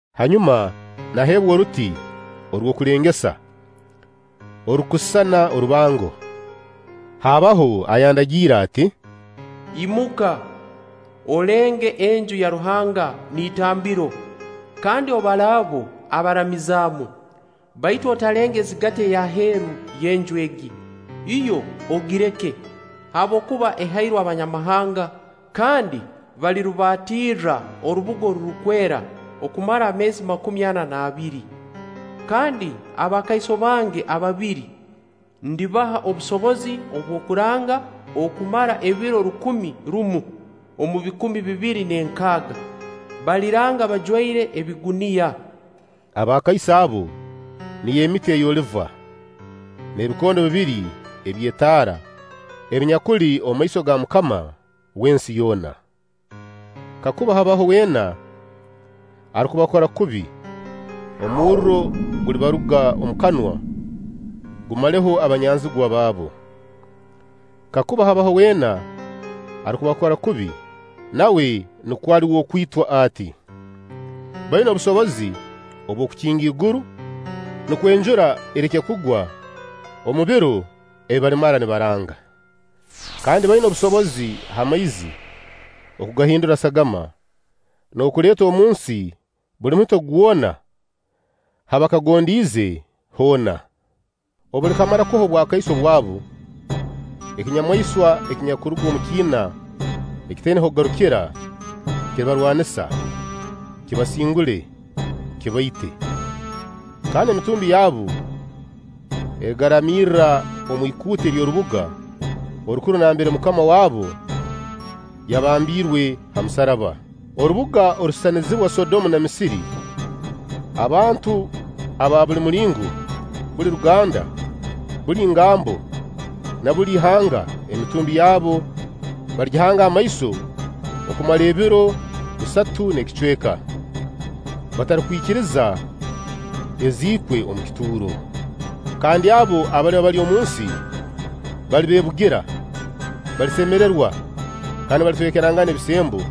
Hanyuma naheebwa oruti orw'okulengesa, orurukusisana orubango; haabaho ayandagiire ati: “Imuka, olenge Enju ya Ruhanga n'itambiro, kandi obale abo abaramizaamu; baitu otalenga ezigati ey'aheeru y'Enju egi; yo ogireke, habwokuba ehairwe Abanyamahanga kandi balirubaatirra orubuga orurukwera okumara ameezi makumi ana n'abiri. Kandi abakaiso bange ababiri ndibaha obusobozi obw'okuranga okumara ebiro rukumi rumu omu bikumi bibiri n'enkaaga, baliranga bajwaire ebiguniya.” Abakaiso abo niyo emiti ey'oliva, n'ebikondo bibiri eby'etaara ebinyakuli omu maiso ga MUKAMA w'ensi yoona. Kakuba habaho weena arukubakora kubi, omurro gulibaruga omu kanwa, gumaleho abanyanzigwa baabo. Kakuba habaho weena arukubakora kubi, nawe nukwo ali w'okwitwa ati. Baina obusobozi obw'okukinga iguru, nukwo enjura ereke kugwa omu biro ebi balimara nibaranga. Kandi baina obusobozi ha maizi okugahindura sagama, n'okuleeta omunsi buli muhito gwona ha bakagondiize hoona. Obu balikamara kuha obwakaiso bwabu, ekinyamaiswa ekinyakuruga omu kiina ekitaina h'okugarukira kiribarwanisa, kibasingule, kibaite; kandi emitumbi yabu erigaraamirra omu ikuute ery'orubuga orukuru nambere MUKAMA wabo yabambiirwe ha musaraba, orubuga orusisanizibwa Sodomu na Misiri. Abantu aba buli mulingo, buli ruganda, buli ngambo, n'aba buli ihanga emitumbi yabo baligihanga amaiso okumara ebiro bisatu n'ekicweka, batarukwikiriza eziikwe omu kituuro. Kandi abo abaliba bali omunsi balibeebugira, balisemererwa kandi balitwekerangana ebisembo,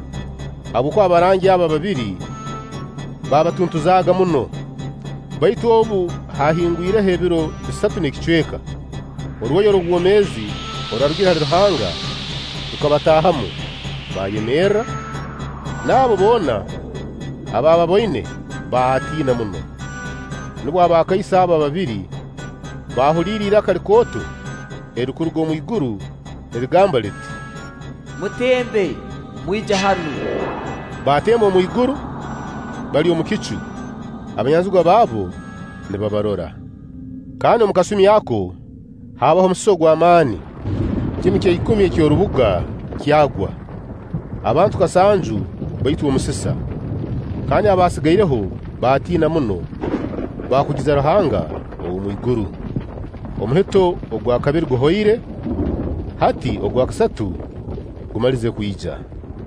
habwokuba abarangi abo ababiri baabatuntuzaaga muno. Baitu obu haahingwireho ebiro bisatu n'ekicweka, orwoya orw'obwomeezi orwarugire hali Ruhanga rukabataahamu, baayemerra; n'abo boona abaababoine baatiina muno. Nubwo abakaiso abo ababiri baahuliire iraka likooto erirukuruga omwiguru nirigamba liti: “Mutembe, mwije hanu!” Baatemba omu iguru, bali omu kicu, abanyanzigwa baabo nibabarora. Kandi omu kasumi ako haabaho omusisa ogw'amaani, kimu kya ikumi eky'orubuga kyagwa; abantu kasanju baitwa omusisa, kandi abaasigaireho baatina muno, baakugiza Ruhanga ow'omwiguru. Omuhito ogwa kabiri guhoire, hati ogwa kasatu gumalize kwija.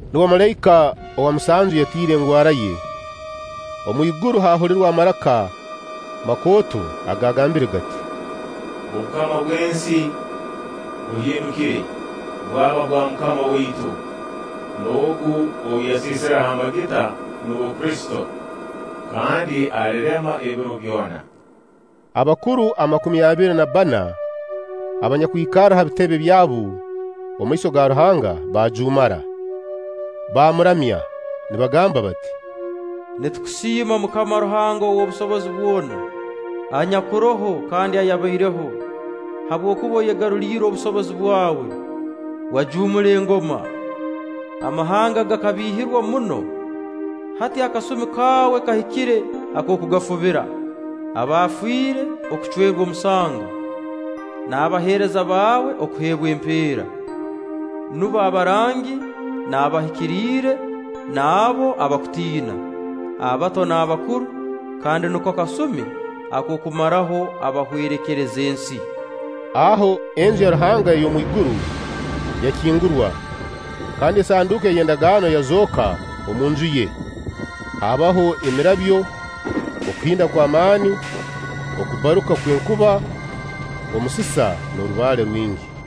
Nubwo malaika owa musanju yatiire engwara ye, omu iguru haahulirwa amaraka makooto agaagambire gati: “Obukama bw'ensi buhindukire, bwaba bwa MUKAMA waitu n'Ogu ou yaseesireho amagita (nuwe Kristo), kandi alirema ebiro byona.” Abakuru amakumi abiri na bbana abanyakwikarra ha bitebe byabu omu maiso ga Ruhanga baajuumara, baamuramya, nibagamba bati: “Nitukusiima MUKAMA Ruhanga ow'obusobozi bwona, anyakuroho kandi ayabaireho, habwokuba oyegaruliire obusobozi bwawe, wajuumura engoma. Amahanga gakabiihirwa muno, hati akasumi kawe kahikire ak'okugafubira: abafiire okucwerwa omusango, n'abaheereza baawe okuheebwa empeera, nubo abarangi n'abahikiriire n'abo abakutiina, abato n'abakuru kandi nuko kasumi ak'okumaraho abahwerekereza ensi.” Aho Enju ya Ruhanga ey'omwiguru yakingurwa, kandi esanduuko ey'endagaano yazooka omu Nju ye; haabaho emirabyo, okuhinda kw'amaani, okubbaruka kw'enkuba, omusisa n'orubaale rwingi.